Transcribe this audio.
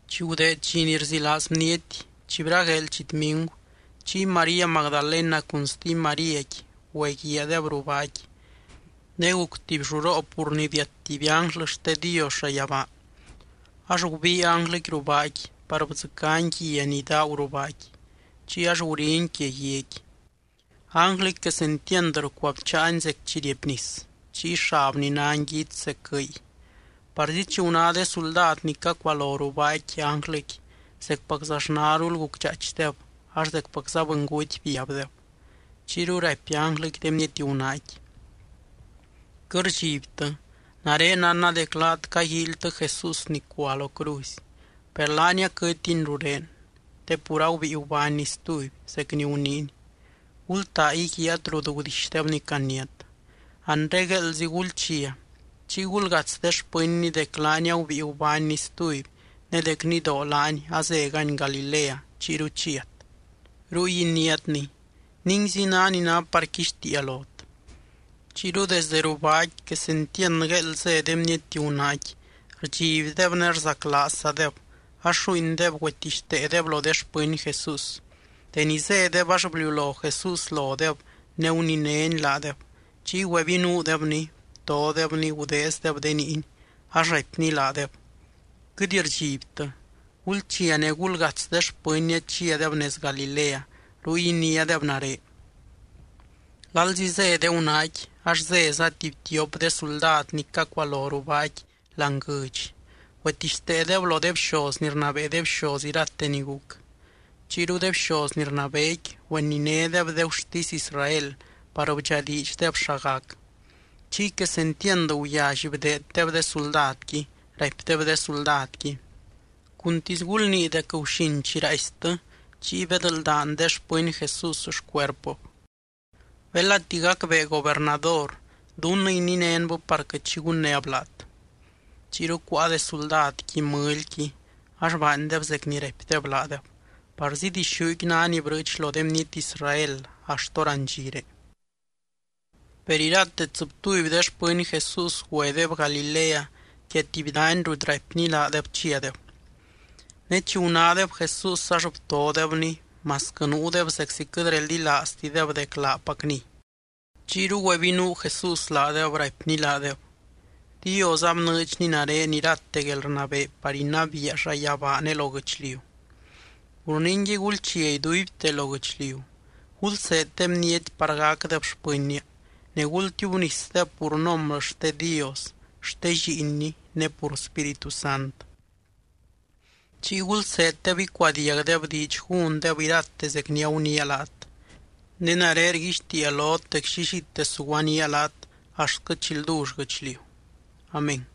Chi gudeed dxi ni rzilaaz bniety, chi bragueel chitmingu, chiy María Magdalena cun stuby Maríaqui güeguiaadeb ruu baaqui. Ne guc tuby lluroo, pur ni biat tuby ánglɨ xte Dios llayabaa, ax gubii ánglɨqui ruu baaqui par bdzɨcány guia ni daagu ruu baaqui, chiy ax guriny quia guiaqui. Ánglɨqui quesentiand rcuabcháany zec chi riepnis, chiy xabny ná nguits zec guɨy. Parzi chi guná de suldad ni cacualo ruu baaqui ánglɨqui, zecpaczaxnarul gucdxaaichdeb ax zecpacza bɨnguty biabdeb. Chiyru raipy ánglɨqui de bniety gunaaqui: —Quɨt rdxibtɨ. Nare nánna dec laat caguíilytɨ Jesús ni cua lo cruzy. Per laany aquɨtiny rurén, te pur agubíi gubánny stuby, zec ni guniiny. Gultaa íguiaat rut gudixdebny caniát. Anre gueeldzi gulchia, chiy gulgats de xpɨnny dec laany agubíi gubánny stuby ne dec nidoo laany azégany Galilea chiyru chiat. Ruy iniátny. Ninguizi ná ni ná par quixtiia lot. Chiyru desde ruu baaqui quesentiand gueeld zé de bniety gunaaqui, rdxibdeb ne rzaclaazzadeb, ax lluuindeb güetixteedeb lo de xpɨny Jesús. Deni zédeb ax bliulo Jesús lodeb ne guninény laadeb. Chiy güebinuudebny, btodebny, gudeezdeb de niiny. Ax raipny laadeb: —Quɨt rdxibtɨ. Gulchia ne gulgats de xpɨnnia chiadeb nez Galilea, ruy iniádeb nare. Lalzi zé de gunaaqui, ax zéza tuby tiop de suldad ni cacualo ruu baaqui láani guɨdx, güetixteedeb lo de bxoz ni rnabee de bxoz irate ni guc. Chiyru de bxoz ni rnabeequi güeninédeb de gurtisy Israel par bdxadiidxdeb xa gac. Chiy quesentiand guyally bdeeddeb de suldadqui, raipdeb de suldadqui: —Cuntisy gulnii dec guxin chi raaistɨ, chiy bedldaan de xpɨny Jesús xcuerpɨb. Belati gacbee gobernador, dunnɨ ininénbɨ par quɨt xi gunnéb laat. Chiyru cuáa de suldadqui mɨlyqui, ax baandeb zec ni raipdeb laadeb. Parzi dixúqui ná ni brɨɨch lo de bniety Israel axt hórandxire. Per irate tsɨbtuby de xpɨny Jesús güedeb Galilea quia tuby dany rut raipny laadeb chiadeb. Ne chi gunádeb Jesús ax btodebny, masquɨ nuudeb zeczi quɨt reldilaaztideb dec laacpacniy. Chiyru güebinuu Jesús laadeb, raipny laadeb: —Dios abnɨɨdxny nare irate guelrnabee par inabiia llayabaa ne lo guɨchliu. Pur ningui, gulchia iduibte lo guɨchliu, gulseed de bniety par gacdeb xpɨnnia, ne gultiubnisdeb pur nombrɨ xte Dios, xte Lliinny ne pur Spíritu Sant. Chiy gulseeddeb icuadiagdeb diidx gúndeb irate zec ni aguniia laat. Ne nare rguixtiia lot dec llillite suguanía laat axtquɨ chi ldull guɨchliu. Amén.